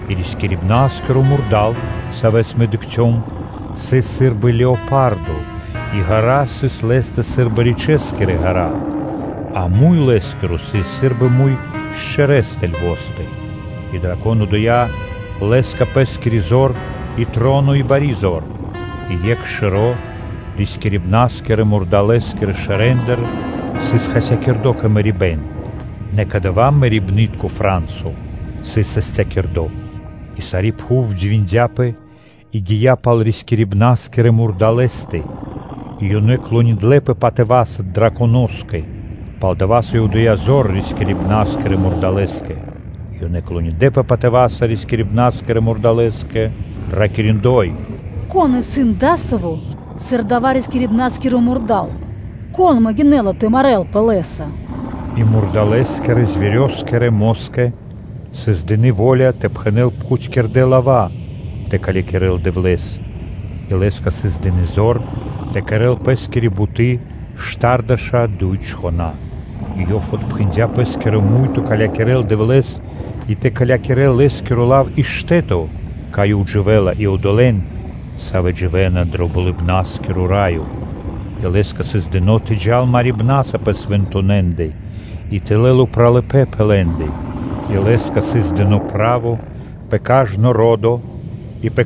И рискирибна́скиро мурда́л, савэ́с мэ дыкхцём, сыс сы́рбы леопардо, а ґэра́ (пирэ́) сыс лэ́стэ сы́рбы ричэскирэ ґэра́, а муй лэ́скиро сыс сы́рбы муй шчэрэстэ (левостэ). И драконо дыя́ лэ́скэ пэ́скири зор и троно и бари зор. И екх шэро́ рискирибна́скирэ – мурдалэскирэ шэрэндыр сыс хасякирдо кэ мэрибэ́н, нэ дава́ мэрибнытко фра́нсо (рана) сыс састякирдо. И сари́ пхув дивиндяпэ и гия́ пал рискирибна́скирэ мурдалэ́стэ. И ёнэ клониндлэпэ драконоскэ, саво́ дыя́ зор рискирибна́скирэ мурдалэскэ. И ёнэ клониндлэпэ патыва́са рискирибна́скирэ мурдалэскэ, ракири́: “Кон исын адасаво́, сыр дава́ рискирибна́скиро мурда́л? Кон могинэ́ла (саштынэла) тэ марэ́лпэ лэ́са?” И мурдалэскирэ москэ сыс дыны́ во́ля тэ пхэнэ́л пхутькирдэ́ лава́ тэ калякирэл Дэвлэ́с, и лэ́скэ сыс дыны́ зор тэ кэрэ́л пэ́скири буты́ штардэша́ дуй чхона́. И ёв отпхандя пэ́скиро муй тэ калякирэл Дэвлэ́с и тэ калякирэл Лэ́скиро лав и штэ́то, кай Ёв дживэ́ла и одолэ́н, савэ́ дживэ́на дро Болыбна́скиро Раё. И лэ́скэ сыс дыно́ тэ джал марибна́са пэ свэнтонэндэ и тэ лэл упралыпэ́н пэ лэ́ндэ, и лэ́скэ сыс дыно́ право пэ кажно ро́дыцо (колено) и пэ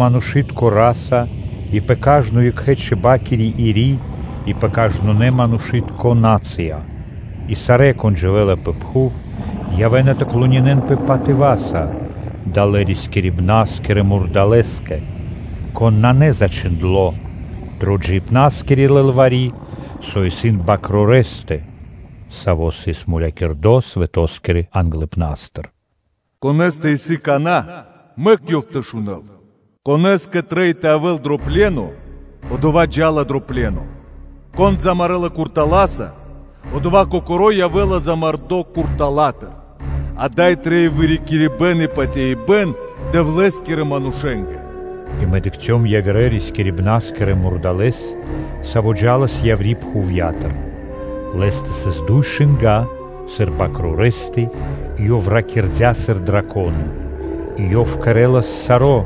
манушы́тко нацыя (народо), и пэ кажно екхэ́-чиба́кири ири́/сэ́м΄я (чиб), и пэ кажно кхэри́тко ро́до (племё). И сарэ́, кон дживэ́ла пэ пхув, явэ́на тэ клонинэнпэ патыва́са далэ́ рискирибна́скирэ мурдалэскэ, кон исын на зачхиндло́ дрэ джиибна́скири лылвари́, сави́ исын Свэнтонэ́ Бакрорэстэ, Саво́ сыс мулякирдо свэто́скирэ англыпна́стыр. Конэ́стэ исын кана́, мэк ёв тэ шунэ́л. Конэ́скэ трэй тэ лыджа́л дро пле́но, одова́ кокоро́ джа́ла дро пле́но. Кон замарэла куртала́са, одова́ кокоро́ явэ́ла замардо куртала́тыр. Ада́й трэй вырикирибэн и патяибэ́н Дэвлэ́скирэ манушэ́нгэ.” И мэ дыкхцём явирэ рискирибна́скирэ мурдалэ́с, саво́ джа́лас яври́ пхувья́тыр. Лэ́стэ сыс дуй шынга́ сыр бакрорэстэ и ёв ракирдя́ сыр драконо. И ёв кэрэ́лас саро́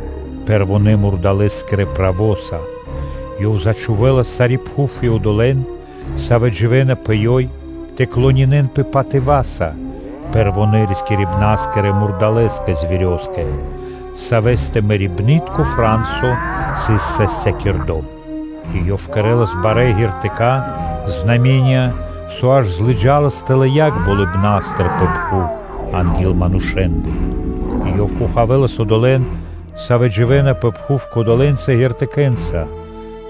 пэрвонэ́-мурдалэ́скирэ право́са. Ёв зачхувэлас сари́ пхув и одолэ́н, савэ́ дживэ́на пэ ёй, тэ клонинэнпэ патыва́са пэрвонэ́ рискирибна́скирэ мурдалэскэ, савэ́стэ мэрибнытко фра́нсо сыс састякирдо. И ёв кэрэ́лас барэ́ знаме́нии (ґертыка́), со аж лыджалас тэлэ́ яг болыбна́стыр пэ пхув анги́л манушэ́ндэ. И ёв хохавэлас одолэ́н, савэ́ дживэ́на пэ пхув кодолэнца ґертыкэ́нца,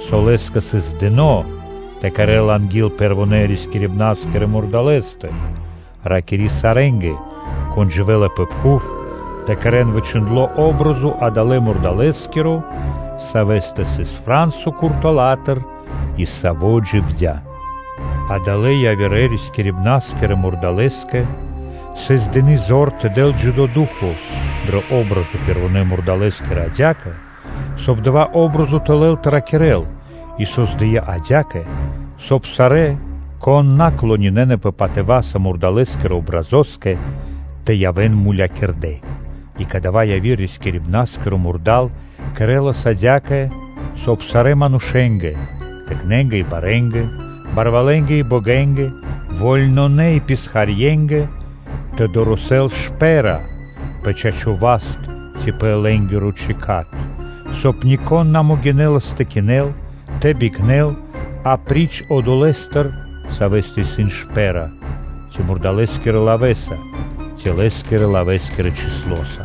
со лэ́скэ сыс дыно́ тэ кэрэ́л анги́л пэрвонэ́-рискирибна́скирэ мурдалэ́стэ, ракири́ сарэ́нгэ, кон дживэ́ла пэ пхув, тэ кэрэ́н дая́ парти́н (о́бразо) адалэ́ мурдалэскири, савэ́стэ сыс фра́нсо куртала́тыр и саво́ дживдя́. Адалэ́ явирэ-рискирибна́скирэ мурдалэскэ сыс дыны́ зор тэ дэл джидо́ ду́хо (фа́но) дрэ дая́ патри́н (о́бразо) пэрвонэ́ мурдалэскири адя́кэ, соб (кай) дая патри́н (о́бразо) тэ лэл тэ ракирэ́л и создыя́ адя́кэ, соб (кай) сарэ́, кон на клонинэнапэ патыва́са мурдалэскирэ патринякэ (образоскэ), тэ явэ́н мулякирдэ́. И кадава́ яви́р рискирибна́скиро мурда́л кэрэ́лас адя́кэ, соб (кай) сарэ́ манушэ́нгэ, тыкнэнгэ и барэнгэ, барвалэнгэ и богэнгэ, вольнонэ и писхарье́нгэ тэ дорэсэн шпэ́ра (знако) пэ чачо́ (право) васт ци пэ лэ́нгиро чэкат; соб (кай) нико́н на могинэлас тэ кинэл, тэ бикнэл апри́ч одолэ́стэ, савэ́стэ исын шпэ́ра; ци мурдалэскирэ лавэ́са ци лэ́скирэ-лавэ́скирэ гинэ́са (чыслоса).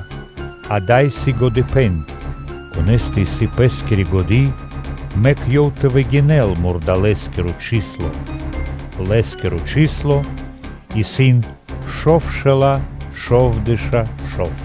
Ада́й исын годыпэ́н. Конэ́стэ исын пэ́скири годы́, мэк ёв тэ выгинэл мурдалэскиро гин (чысло): дава́ исын манушы́тко гин (чысло), лэ́скиро гин (чысло) исын шовшэла́ шовдэша́ шов.